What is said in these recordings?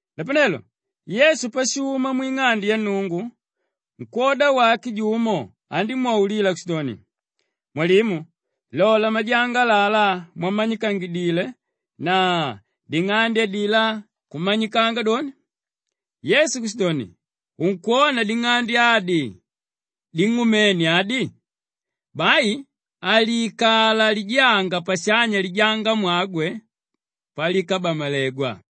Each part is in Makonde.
Napanelo Yesu pashuma mwing'ande ya Nnungu nkwóda wake jumo andímwaulila kushidoni, “Mwalimu, lola majanga alalá mwamanyikangidile na ding'ande adilá kumanyikanga doni!” Yesu kushidoni, “Unkwona ding'ande adi ding'umene adi? Bai haliikala lijanga pashanya lijangamwagwe palikabamalegwa.”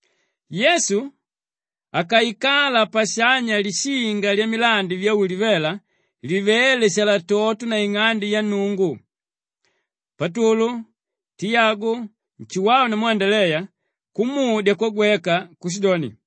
Yesu akaikala pashanya lishinga lyamilandi vya Ulivela livéle shalatoto naing'ande ya Nnungu, Patulu, Tiyagu, Nshuwau namu Andaleya kumudya kwagweka kushidoni,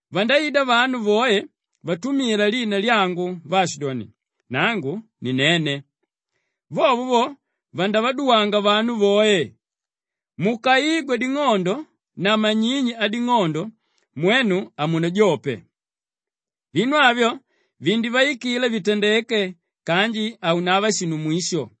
Vandaida vanu voe vatumila lina lyangu vaashidoni, ‘Nangu ni nene!’ Vovo vo, vandavaduwanga vanu voe. Mukaigwa ding'ondo na manyinyi ading'ondo mwenu hamunajope. Vinu avyo vindivaikila vitandeke kanji haunava shinu mwisho.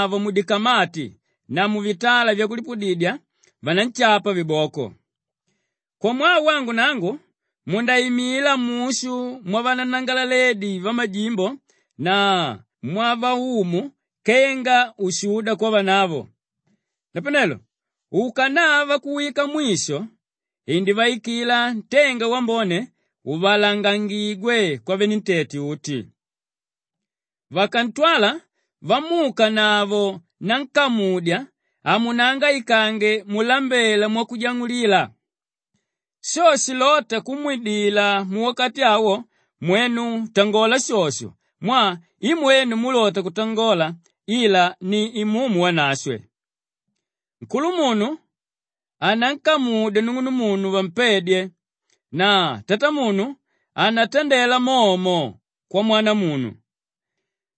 “Mwenu lilaledye! Vanu vandamuukanavo mudikamati na muvitala vyakulipudidya vananshapa viboko. Kwamwaa wangu nangu mundaimila mushu mwavananangalaledi vamajimbo na mwavaumu kenga ushuda kwavanavo. Napanelo ukanava kuwika mwisho indivaikila ntenga wambone uvalangangigwe kwavenentete uti. Vakantwala vamuukanavo nankamudya, hamunangaikange mulambela mwakujang'ulila. Sho shilóta kumwidila muwakati awo mwenu tangola shosho mwaa i mwenu múlota kutangola ila ni Imumu Wanashwe. Nkulumunu anankamudya nung'unumunu vampedye na tatamunu anatandela momo kwamwanamunu.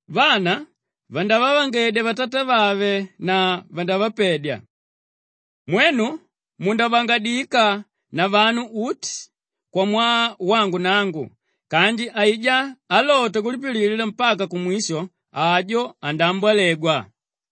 Vana vandavavangedya vatatavave na vandavapedya. Mwenu mundavangadika na vanu uti kwamwaa wangu nangu kanji aijá álota kulipililila mpaka kumwisho, ajo andaambolegwa.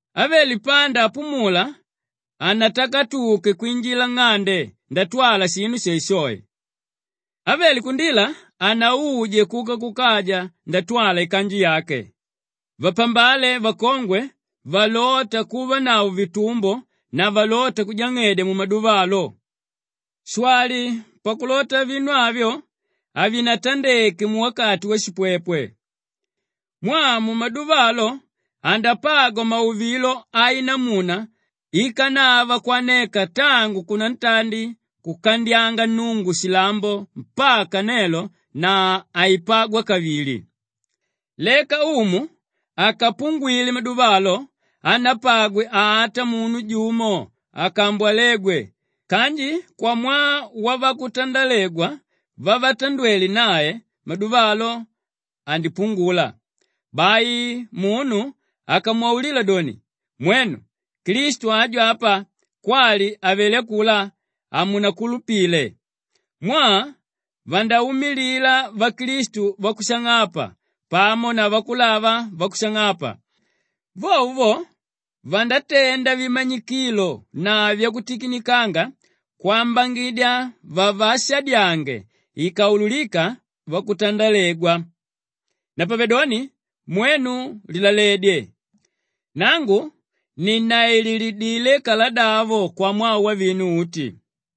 Ávele panda apumula hanatakatuke kwinjila nng'ande ndatwala shinu shoeshoe. Ávele kundila hanauje kuka kukaja ndatwala ikanju yake. Vapambale vakongwe valóta kuvanavo vitumbo na valóta kujang'edya mumaduva alo. Shwali pakulota vinu avyo havinatandeke muwakati washipwepwe. Mwaa mumaduva alo andapagwa mauvilo ainamuna íkanava kwaneka tangu kunantandi kukandyanga Nnungu shilambo mpaka nelo na haipagwa kavili. Leka Umu akapungwile maduva alo hanapagwe ata munu jumo akambwalegwe kanji kwamwaa wavakutandalegwa vavatandwele nae, maduva lo, andipungula. Bai munu akamwaulila doni, ‘Mwenu, Klistu aju apa,’ kwali, ‘Avelé akulá,’ hamunankulupile. Mwaa vandaumilila vaklistu vakushang'apa pamo na vakulava vakushang'apa. Vovo vo, vandatenda vimanyikilo na vyakutikinikanga kwambangidya vavaashadyange ikaulukika vakutandalegwa. Napavedoni mwenu lilaledye! Nangu ninnaililidile kaladavo kwamwaa wavinu uti.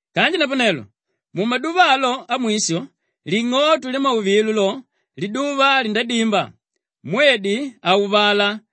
“Kanji napanelo mumaduva alo amwisho, ling'oto lyamauvilo lo, liduva lindadimba, mwedi hauvala,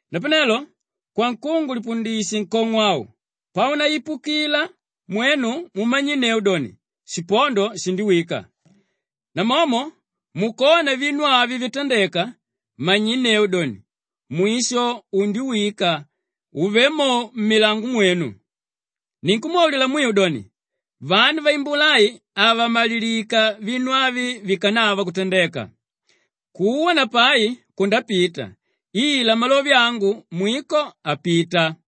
“Napanelo kwankungu lipundishe nkong'o au, paunaipukila mwenu mumanyinneu doni, shipondo shindiwika. Namomo mukona vinu avyo vitandeka manyinneu doni, mwisho undiwika, uvé mo mmilango myenu. Ninkumwaulila mwiu doni, vanu vaimbula ai havamalilika vinu avi vikanava kutandeka. Kuwa na pai kundapita ila malove angu mwiko hapita.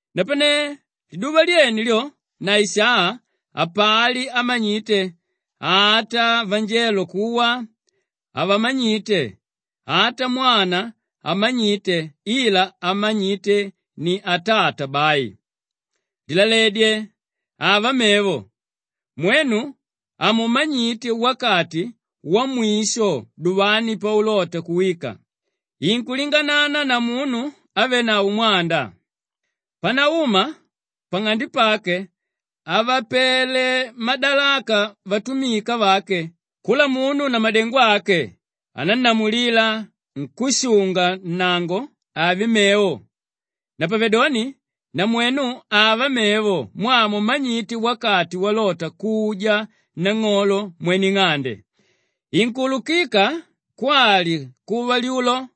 “Napane liduva lyene lyo na isaa, hapali ámanyite, ata vanjelo kuwa havamanyite, ata Mwana hamanyite ila ámanyite ni Atata bai. Lilaledye, ava mevo! Mwenu hamumanyite wakati wamwisho duvani paulota kuwika. Inkulinganana na munu ávenavo mwanda. Panauma pang'ande pake avapele madalaka vatumika vake kula munu na madengo ake anánnamulila nkúshunga-nnango ave mevo. Napavedoni namwenu ava mevo mwaa hamumanyite wakati walota kuja nang'olo mwene ing'ande; inkuulukika kwali kuva lyulo,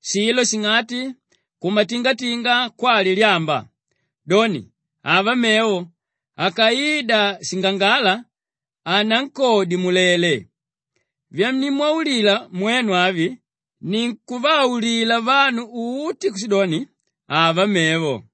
shilo shing'ati, kumatingatinga kwali lyamba. Doni, ava mevo, akaida shingangala hanankodye mulele. Vyanimwaulila mwenu avi, ninkuvaulila vanu uti kushidoni, ava mevo!”